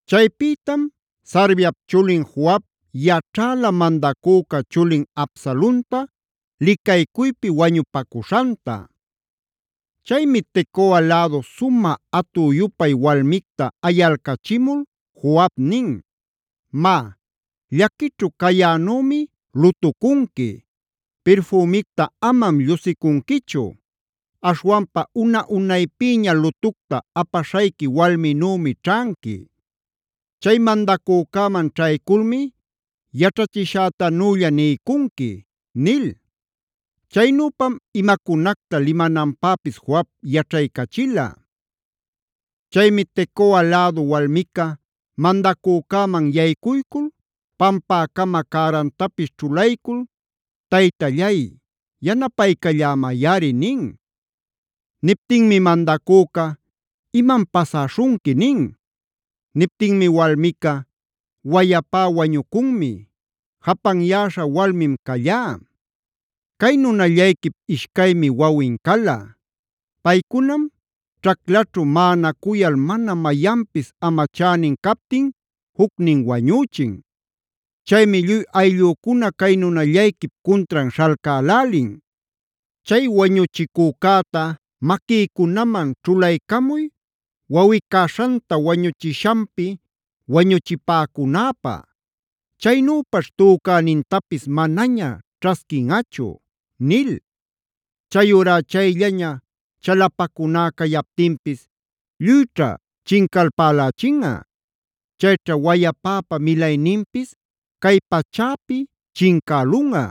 Chaypïtam Sarviap chulin Joab yaćhäla mandacüca chulin Absalonta licaycuypi wañupacuśhanta. Chaymi Tecoa lädu sumä atü-yupay walmicta ayalcachimul Joab nin: “Má, llaquićhu cayänümi lutucunqui; pirfümicta amam llusicunquichu. Aśhwanpa una-unaypïña lutucta apaśhayqui walminümi ćhanqui. Chay mandacücäman ćhayculmi yaćhachishätanülla niycunqui” nil. Chaynüpam imacunacta limananpäpis Joab yaćhaycachila. Chaymi Tecoa lädu walmica mandacücäman yaycuycul pampäcama cärantapis ćhulaycul: “¡Taytallay, yanapaycallämayꞌari!” nin. Niptinmi mandacüca: “¿Imam pasäśhunqui?” nin. Niptinmi walmica: “Wayapá wañucunmi; japanyäśha walmim callá. Cay nunallayquip ishcaymi wawin cala. Paycunam ćhaclaćhu maꞌanacuyal mana mayanpis amachänin captin jucnin wañüchin. Chaymi lluy ayllücuna cay nunallayquip cuntran śhalcälälin: ‘Chay wañuchicücäta maquïcunaman ćhulaycamuy wawꞌi-caśhanta wañuchishanpi wañuchipäcunäpä. Chaynüpaćh tücänintapis manaña ćhasquinꞌachu’ nil. Chayurá chayllaña chalapacuná cayaptinpis lluyćha chincalpälächinꞌa. Chayćha wayapäpa milayninpis cay pachäpi chincälunꞌa”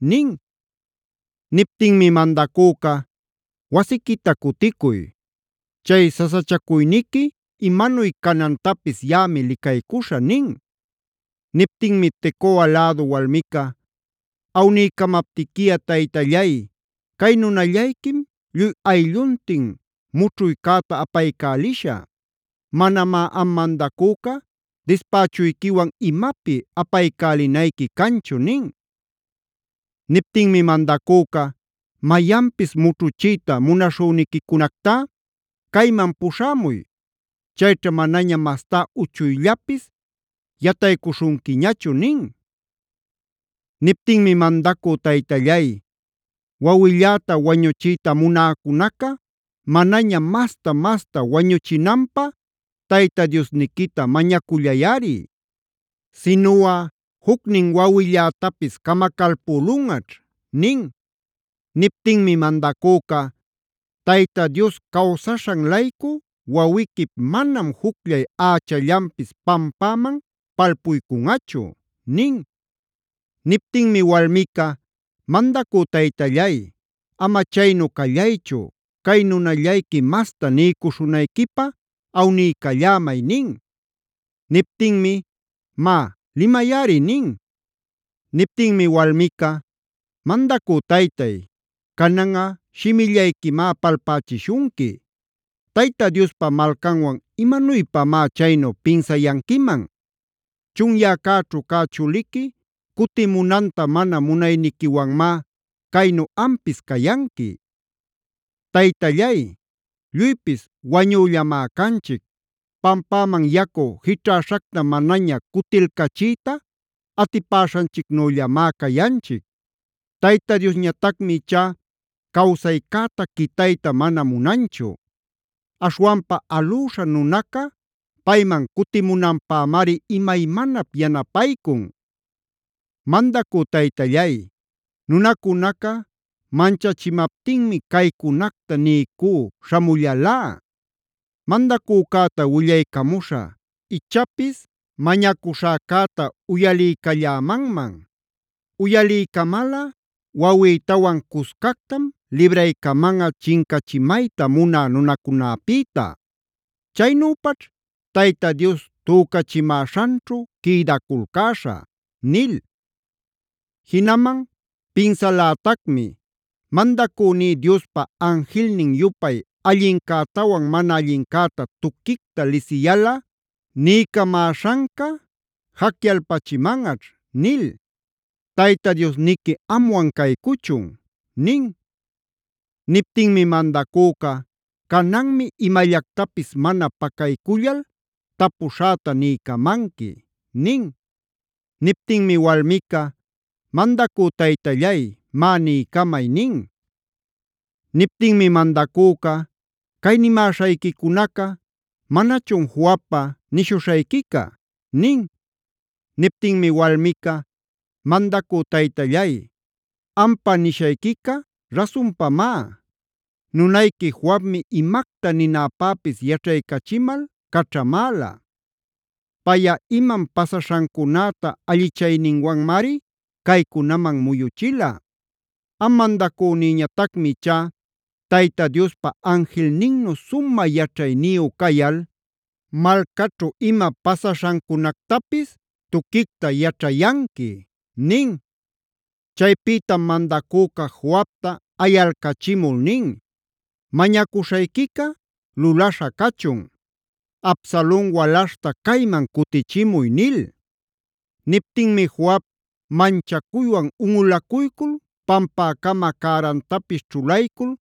nin. Niptinmi mandacüca: “Wasiquita cuticuy. Chay sasachacuyniqui imanuy canantapis yaꞌami licaycuśhä” nin. Niptinmi Tecoa lädu walmica: “Awniycamaptiqui taytallay, cay nunallayquim lluy aylluntin mućhuycäta apaycälishä. Manamá am mandacüca dispächuyquiwan imapi apaycälinayqui canchu” nin. Niptinmi mandacüca: “Mayanpis mućhuchiyta munaśhüniquicunactá cayman puśhämuy. Chayćha manaña mastá uchuyllapis yataycuśhunquiñachu” nin. Niptinmi: “Mandacü taytallay, wawilläta wañuchiyta munäcunaca manaña masta-masta wañuchinanpä Tayta Diosniquita mañacullayꞌari, sinuꞌa jucnin wawillätapis camacalpülunꞌaćh” nin. Niptinmi mandacüca: “¡Tayta Dios cawsaśhan-laycu wawiquip manam jucllay ächallanpis pampäman palpuycunꞌachu!” nin. Niptinmi walmica: “Mandacü taytallay, ama chaynu callaychu cay nunallayqui masta niycuśhunayquipä awniycallämay” nin. Niptinmi: “Má, limayꞌari” nin. Niptinmi walmica: “Mandacü taytay, cananꞌa shimillayquimá palpächishunqui. ¿Tayta Diospa malcanwan imanuypamá chaynu pinsayanquiman? Chunyäcäćhu cä chuliqui cutimunanta mana munayniquiwanmá caynu ampis cayanqui. Taytallay, lluypis wañüllamá canchic. Pampäman yacu jićhaśhacta manaña cutilcachiyta atipäśhanchicnüllamá cayanchic. Tayta Diosñatacmi ichá cawsaycäta quitayta mana munanchu. Aśhwanpa alüśha nunaca payman cutimunanpämari imaymanap yanapaycun. “Mandacü taytallay, nunacunaca manchachimaptinmi caycunacta niycü śhamullalá: ‘Mandacücäta willaycamuśhä ichapis mañacuśhäcäta uyaliycallämanman. Uyaliycamalꞌa wawïtawan cuscactam libraycamanꞌa chincachimayta munä nunacunäpïta. Chaynüpaćh Tayta Dios tücachimäśhanćhu quïdaculcäśhä’ nil. Jinaman pinsalätacmi: ‘Mandacüní Diospa anjilnin-yupay allincätawan mana allincäta tuquicta lisiyalꞌa niycamäśhanca jacyalpachimanꞌaćh’ nil. ¡Tayta Diosniqui amwan caycuchun!” nin. Niptinmi mandacüca: “Cananmi imallactapis mana pacaycullal tapuśhäta niycamanqui” nin. Niptinmi walmica: “Mandacü taytallay, má niycamay” nin. Niptinmi mandacüca: “Cay nimäśhayquicunaca ¿manachun Joabpa nishuśhayquica?” nin. Niptinmi walmica: “¡Mandacü taytallay, ampa nishayquica rasunpamá! Nunayqui Joabmi imacta ninäpäpis yaćhaycachimal caćhamäla. Payꞌa imam pasaśhancunäta allichayninwanmari caycunaman muyuchila. Am mandacünïñatacmi ichá Tayta Diospa anjilninnu sumä yaćhayniyu cayal malcaćhu ima pasaśhancunactapis tuquicta yaćhayanqui” nin. Chaypïtam mandacüca Joabta ayalcachimul nin: “Mañacuśhayquica lulaśha cachun. Absalon walaśhta cayman cutichimuy” nil. Niptinmi Joab manchacuywan unꞌulacuycul pampäcama cärantapis ćhulaycul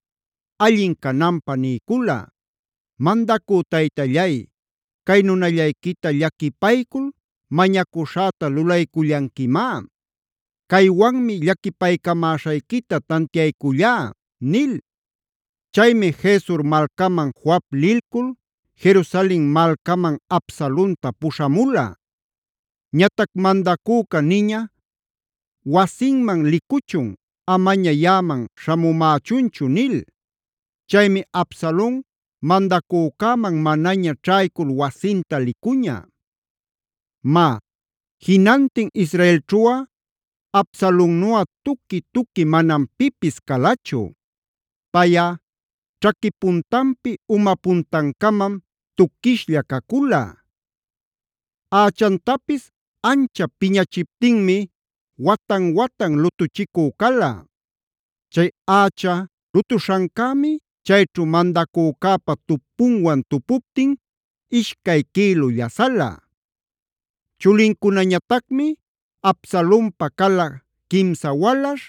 allin cananpä niycula: “Mandacü taytallay, cay nunallayquita llaquipaycul mañacuśhäta lulaycullanquimá. Caywanmi llaquipaycamäśhayquita tantiaycullá” nil. Chaymi Gesur malcaman Joab lilcul Jerusalen malcaman Absalonta puśhamula. Ñatac mandacüca niña: “Wasinman licuchun; amaña yaꞌaman śhamumächunchu” nil. Chaymi Absalon mandacücäman manaña ćhaycul wasinta licuña. Má, jinantin israelćhuꞌa Absalonnuꞌa tuqui-tuqui manam pipis calachu. Payꞌa ćhaqui puntanpi uma puntancamam tuquishlla cacula. Ächantapis anchap piñachiptinmi watan-watan lutuchicü cala. Chay ächa lutuśhancämi chayćhu mandacücäpa tupunwan tupuptin ishcay quïlu llasala. Chulincunañatacmi Absalonpa cala, quimsa walaśh,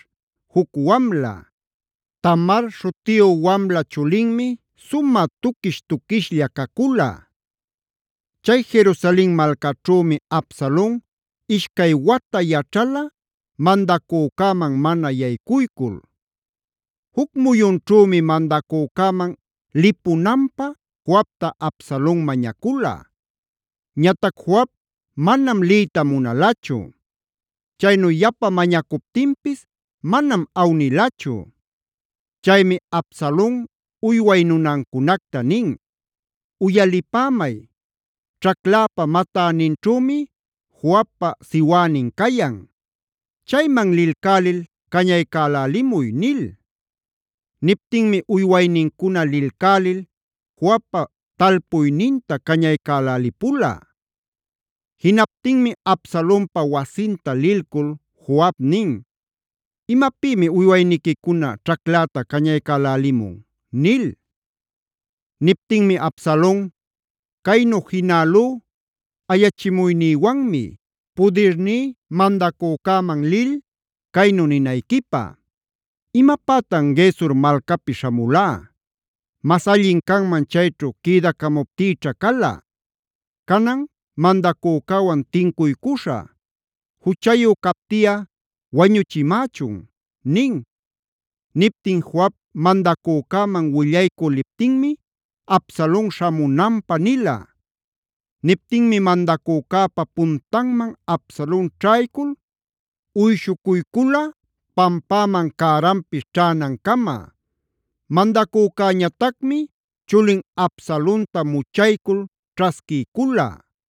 juc wamla. Tamar śhutiyu wamla chulinmi sumä tuquish-tuquishlla cacula. Chay Jerusalen malcaćhümi Absalon ishcay wata yaćhala mandacücäman mana yaycuycul. Juc muyunćhümi mandacücäman lïpunanpä Joabta Absalon mañacula. Ñatac Joab manam liyta munalachu. Chaynu yapa mañacuptinpis manam awnilachu. Chaymi Absalon uyway nunancunacta nin: “Uyalipämay, ćhacläpa matäninćhümi Joabpa siwänin cayan. ¡Chayman lilcälil cañaycälälimuy!” nil. Niptinmi uywaynincuna lilcälil Joabpa talpuyninta cañaycälälipula. Jinaptinmi Absalonpa wasinta lilcul Joab nin: “¿Imapïmi uywayniquicuna ćhacläta cañaycälälimun?” nil. Niptinmi Absalon: “Caynu jinälú ayachimuynïwanmi, pudirní mandacücäman lil caynu ninayquipä: ‘Imapätan Gesur malcapi śhamulá. Mas allin canman chayćhu quïdacamuptïćha cala. Canan mandacücäwan tincuycuśhä; juchayu captiꞌa wañuchimächun’” nin. Niptin Joab mandacücäman willaycü liptinmi Absalon śhamunanpä nila. Niptinmi mandacücäpa puntanman Absalon ćhaycul uyshucuycula pampäman cäranpis ćhänancama. Mandacücäñatacmi chulin Absalonta muchaycul ćhasquiycula.